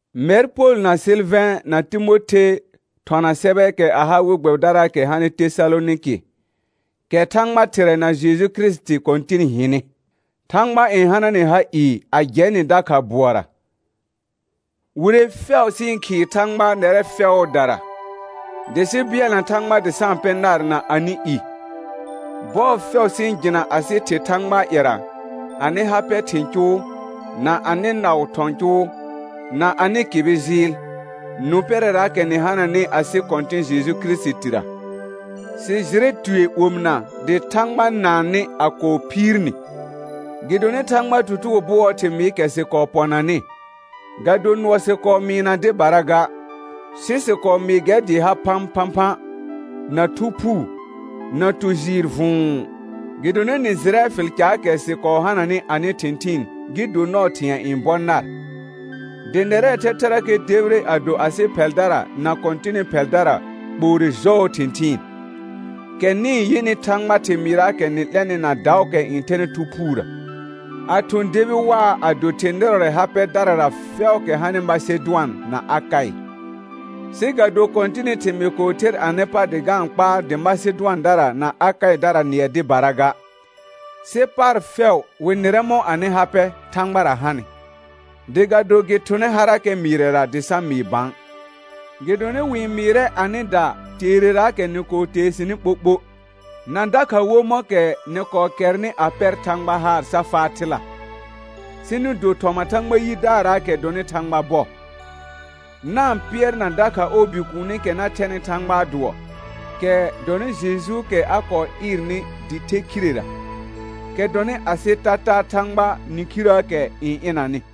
Mɛr Pol na Sɩlvɛ̃ na Timothe thɔna sɛbɛɛkɛ a ha we gbɛbɩdaraakɛ hanɩ Tesalonɩkɩ, kɛ Thãgba Thɩrɛ na Jeju Kirisiti Kɔ̃tɩn hɩnɩ. Thãgba n hana nɩ ha ɩɩ a jɛ nɩ dakha bʋɔra. Wire fɛʋ sɩ-n khɩɩ Thãgba nɛrɛ fɛʋʋdara, dɩ sɩ bɩɛlna Thãgba dɩ sa-n pɛ nar na anɩ i. Bɔɔ fɛʋ sɩ-n jɩna asɩ Thɩ Thãgbaa ƴɛra, anɩ ha pɛ thɩ̃ cʋʋ, na anɩ naʋ thɔ̃ cʋʋ, na anɩ kɩbɩ jɩɩl, nũ pɛrɛraakɛ nɩ hananɩ asɩ Kɔ̃tɩ̃ Jeju Kirisitira. Sɩ jɩrɛ tue omɩna dɩ Thãgba naan nɩ a kɔɔ phiir ni. Gɩdonɩ Thãgbaa tutugo bʋɔɔ thɩmɩɩkɛ sɩ kɔɔ pɔnanɩ, ga do nʋɔ sɩ kɔɔ mɩɩna dɩbara ga, sɩ sɩ kɔɔ mɩɩ gɛr dɩɩ ha phãphãphã, na Thu Phuu, na tu jɩɩr vʋ̃ʋ; gɩdonɩ nɩ jɩrɛ fɩl caakɛ sɩ kɔɔ hananɩ anɩ thɩ̃thɩɩn gɩ do nɔɔ thɩ̃ɛ n bɔ nar. Dɩ nɛrɛɛ thɛthɛrakɛ debire a do asɩ ph ɛldara na Kɔ̃tɩnɩ phɛldara kpoore jɔɔ thɩ̃thɩɩn, kɛ nɩ-n yɩnɩ Thãgbaa thɩmɩɩraakɛ nɩ-n 'lɛnɩ na daʋʋkɛ n thɛnɩ Thu Phuurə, a thʋ̃ debi waa a do thɩ̃ nɩrɔrɛ ha pɛdarara fɛʋʋkɛ hanɩ Masedʋan na Akaɩ. Sɩ ga do Kɔ̃tɩnɩ thɩmɩɩ kɔɔ ther anɩ pa dɩ ga-n kpaar dɩ Masedʋandara na Akaɩdara nɩɛ dɩbara ga, sɩ paar fɛʋ wɩ nɩrɛ mɔ̃ anɩ ha pɛ Thãgbara hanɩ, dɩ ga do gɩ thʋnɛ harakɛ mɩɩrɛra dɩ sa mɩɩ bã. Gɩdonɩ wɩ-n mɩɩrɛ asɩda teereraakɛ nɩ kɔɔ tee sɩnɩ ɓoɓo, na dakha wo mɔ̃kɛ nɩ kɔɔ kɛrnɩ a pɛr Thãgba haar sa faa thɩla, sɩ nɩ do thɔma Thãgba yidaarraakɛ dɔnɩ Thãgba bɔ, na-n pɩɛrna dakha ɔɔ Bikuunikɛ na thɛnɩ Thãgbaa dʋɔ, kɛ dɔnɩ Jejuukɛ a kɔɔ ɩɩrnɩ dɩ the khirera, kɛ dɔnɩ asɩ tataa Thãgbaa nĩkhirəəkɛ n ɩnanɩ.